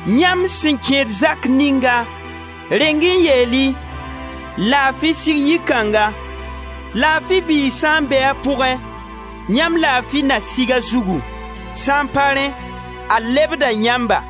Yãmb sẽn kẽed zak ninga, reng-y n yeel-y: ‹Laafi sig yi-kãnga!› Laafi biig sã n be a pʋgẽ, yãmb laafi na sig a zugu, sã n pa rẽ, a lebda yãmba.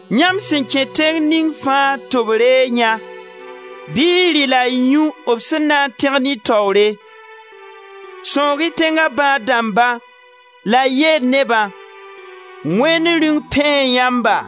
Yãmb sẽn kẽ tẽng ning fãa tɩ b reeg yã, bɩ y rɩ la y yũ b sẽn na n tẽgen y taoore. Sãoog-y tẽnga bãad-dãmba la y yeel nebã: ‹Wẽnd Rĩung pẽe yãmba.›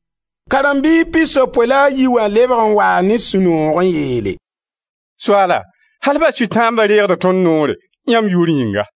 Karen-biis pisopoe la a yi wã lebg n waa ne sũ-noog n yeele: «Soaala, al ba sʋtãamba reegda tõnd noore, yãmb yʋʋr yĩnga.»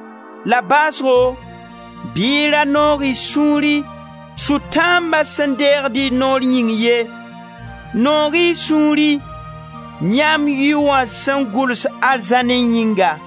La baasgo bɩ y ra noog y sũuri sʋtãamba sẽn deegd y noor yĩng ye, noog-y sũuri yãmb yʋy wã sẽn gʋls arzãnẽ yĩnga.»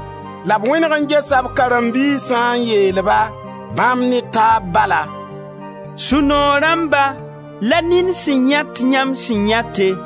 La b wẽneg n gesa b karen-biisã n yeel-ba, bãmb ne taab bala: «Sũ-noog rãmba la nin sẽn yãet yãmb sẽn yãete!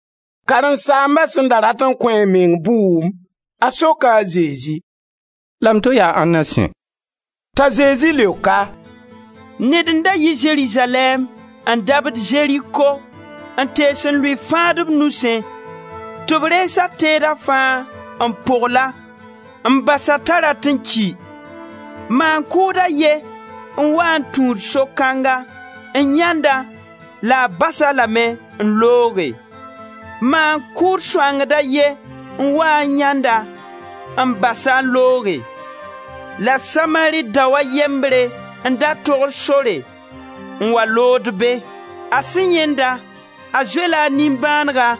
Karen-saamba sẽn da rat n kõ a meng bʋʋm, a soka a Zezi: «La m to yaa ãnna sẽ?» T'a Zezi leok-a: «Ned n da yi Zerizalɛɛm n dabd Zeriko n tees n lʋɩ fãadb nusẽ tɩ b rees a teeda fãa n pogl-a, n bas-a t'a rat n ki. Maan-kʋʋd a ye n waa n tũud so kãnga n yãend-a la a bas-a lame n looge maan-kʋʋd sõangd a ye n waa n yãend-a, n bas-a n looge. La Samari dao a yembre n da togd sore n wa lood be. A sẽn yãend-a, a zoe-la a nimbãanega,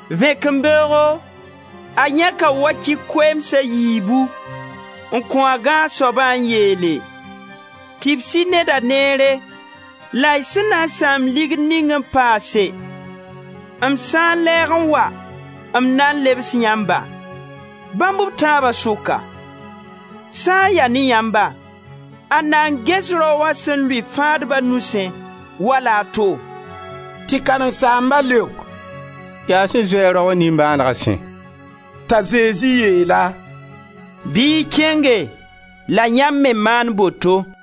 Vẽkembeoogo, a yãka wakɩ koeems a yiibu n kõ a gãag soaba n yeele: ‹Tɩbs-y neda neere, la y sẽn na n sãam ligd ning n paase, m sã n lɛɛg n wa, m na lebs yãmba.› Bãmb b tãaba sʋka, sã n ya ne yãmba, ãnda n ges raoã sẽn lʋɩ fãadba nusẽ wala a to?» Tɩ karen-saamba leok: «Yaa sẽn zoe-a raoã nimbãanega sẽ.» T'a Zezi yeel-a: «Bɩ y kẽnge, la yãmb me maan boto.»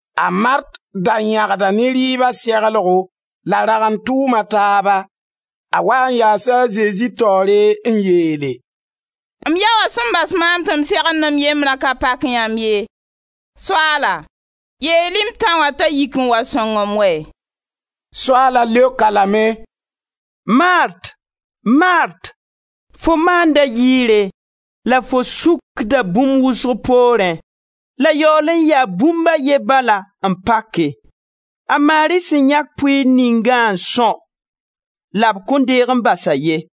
A Mart da yãgda ne rɩɩba seglgo la ragend tʋʋm a taaba; a waa n yaasa a Zezi taoore n yeele: «M yao wã sẽn bas maam tɩ m segend m yembrã ka pak yãmb ye? Soaala, yeel-y m tão wã t'a yik n wa sõng-m wɛ!» Soaala leok-a lame: «Mart, Mart, fo maanda yɩɩre, la fo sũkda bũmb wʋsg poorẽ, la yaool n yaa bũmb a ye bala n pake. A Mari sẽn yãk pʋɩɩr ningã n são, la b kõn deeg n bas-a ye.»